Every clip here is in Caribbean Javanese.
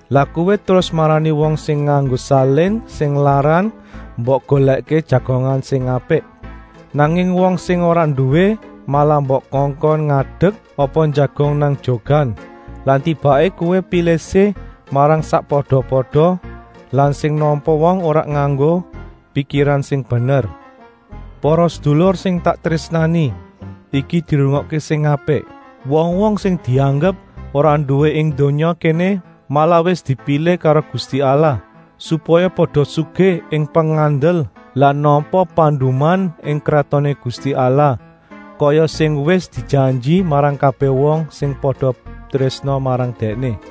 Lah kowé terus marani wong sing nganggo salin sing larang mbok golèkké jagongan sing apik. Nanging wong sing ora nduwé malah mbok kongkon ngadek apa njagong nang jogan. Lah tibaké kowé pilih-sih marang sakpada-pada lan sing nampa wong ora nganggo pikiran sing bener. Para sedulur sing tak trésnani, iki dirungokké sing apik! Wong-wong sing dianggep ora nduwé ing donya kéné malah wis dipilih karo Gusti Allah, supaya pada sugih ing pengandel lan nampa panduman ing Kratoné Gusti Allah, kaya sing wis dijanji marang kabèh wong sing pada trésna marang Dèkné.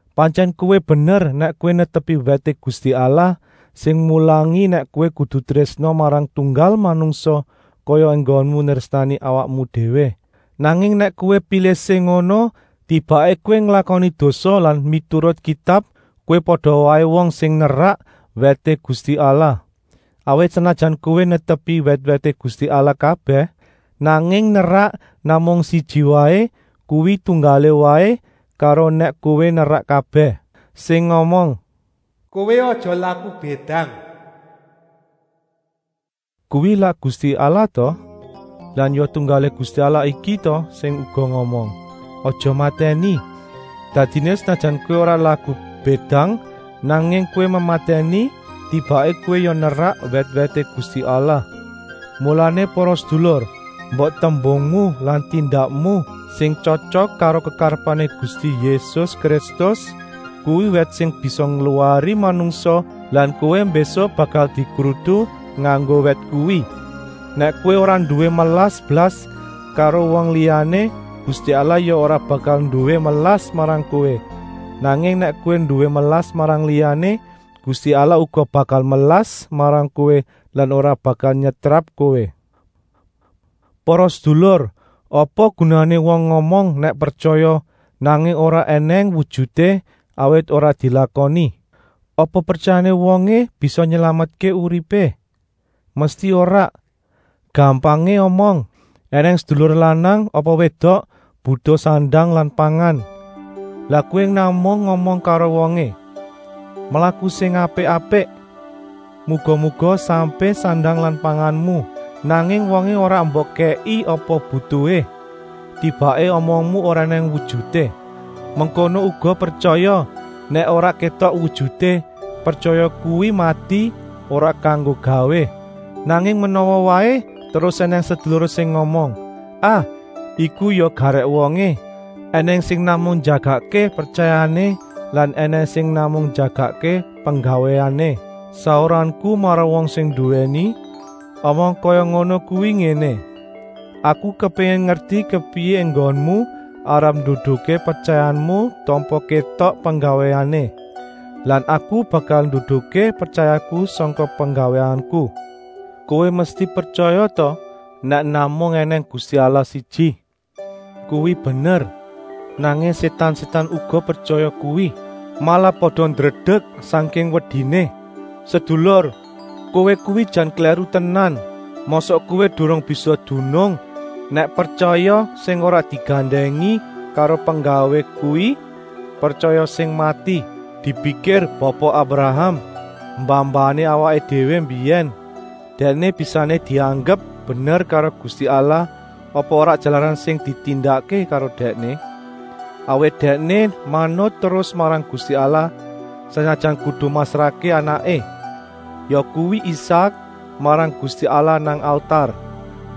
Pantyèn kowé bener nèk kowé netepi wèté Gusti Allah sing mulangi nèk kowé kudu trésna marang tunggal manungsa kaya enggonmu nrésnani awakmu déwé. Nanging nèk kowé pilih-sih ngono, tibaké kowé nglakoni dosa lan miturut Kitab kowé pada waé wong sing nerak wèté Gusti Allah. Awit, senajan kowé netepi wèt-wèté Gusti Allah kabèh, nanging nerak namung siji waé, kuwi tunggalé waé karo nèk kowé nerak kabèh. Sing ngomong: “Kowé aja laku bédang” kuwi lak Gusti Allah ta? Lan ya tunggalé Gusti Allah iki ta sing uga ngomong: “Aja mematèni!” Dadiné senajan kowé ora laku bédang, nanging kowé mematèni, tibaké kowé ya nerak wèt-wèté Gusti Allah. Mulané para sedulur, mbok tembungmu lan tindakmu sing tyotyok karo kekarepané Gusti Yésus Kristus; kuwi wèt sing bisa ngluwari manungsa lan kowé mbésuk bakal dikrutu nganggo wèt kuwi. Nèk kowé ora nduwé melas blas karo wong liyané, Gusti Allah ya ora bakal nduwé melas marang kowé, nanging nèk kowé nduwé melas marang liyané, Gusti Allah uga bakal melas marang kowé lan ora bakal nyetrap kowé. Para sedulur, apa gunané wong ngomong nèk pretyaya, nanging ora ènèng wujuté, awit ora dilakoni. Apa pretyayané wongé bisa nylametké uripé? Mesti ora. Gampangé omong, ènèng sedulur lanang apa wédok butuh sandang lan pangan. Lah kowé namung ngomong karo wongé: “Mlaku sing apik-apik. Muga-muga sampé sandang lan panganmu,” nanging wongé ora mbok kèki apa butuhé. Tibaké omongmu ora ènèng wujuté. Mengkono uga pretyaya, nèk ora kétok wujuté, pretyaya kuwi mati, ora kanggo gawé. Nanging menawa waé terus ènèng sedulur sing ngomong: “Ah, iku ya garèk wongé! Enèng sing namung njagakké pretyayané lan ènèng sing namung njagakké penggawéné.” Sauranku marang wong sing nduwèni omong kaya ngono kuwi ngéné: “Aku kepéngin ngerti kepriyé enggonmu arep nduduhké pretyayamu tanpa kétok penggawéné. Lan aku bakal nduduhké pretyayaku sangka penggawéku.” Kowé mesti pretyaya ta nèk namung ènèng Gusti Allah siji? Kuwi bener! Nanging sétan-sétan uga pretyaya kuwi. Malah pada ndredek sangking wediné. Sedulur, kowé kuwi jan klèru tenan. Mosok kowé durung bisa dunung nèk pretyaya sing ora digandèngi karo penggawé kuwi pretyaya sing mati. Dipikir Bapa Abraham, mbah-mbahané awaké déwé mbiyèn. Dèkné bisané dianggep bener karo Gusti Allah apa ora jalaran sing ditindakké karo dèkné. Awit dèkné manut terus marang Gusti Allah, senajan kudu masrahké anaké, yakuwi Isak, marang Gusti Allah nang altar.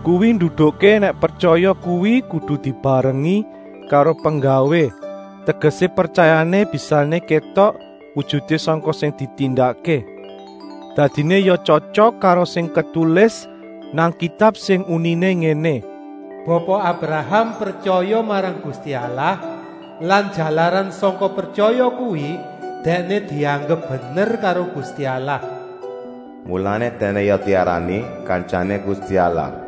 Kuwi nduduhké nèk pretyaya kuwi kudu dibarengi karo penggawé, tegesé, pretyayané bisané kétok wujuté sangka sing ditindakké. Dadiné ya tyotyok karo sing ketulis nang Kitab sing uniné ngéné: “Bapa Abraham pretyaya marang Gusti Allah lan jalaran sangka pretyaya kuwi dèkné dianggep bener karo Gusti Allah.” Mulané dèkné ya diarani “Kantyané Gusti Allah.”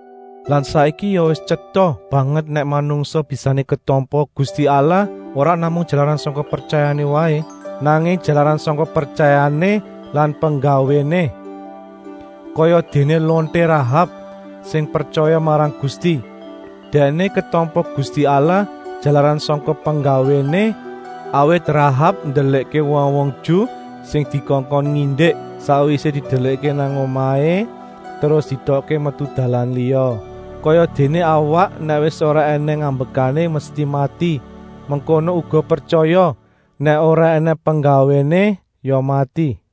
Lan saiki ya wis tyeta banget nèk manungsa bisané ketampa Gusti Allah ora namung jalaran sangka pretyayané waé, nanging jalaran sangka pretyayané lan penggawéné. Kayadéné lonté Rahab, sing pretyaya marang Gusti. Dèkné ketampa Gusti Allah jalaran sangka penggawéné, awit Rahab ndelikké wong-wong Ju sing dikongkon ngindik. Sakwisé didelikké nang omahé terus dietokké metu dalan liya. Kayadéné awak nèk wis ora ènèng ambekané mesti mati, mengkono uga pretyaya, nèk ora ènèng penggawéné ya mati.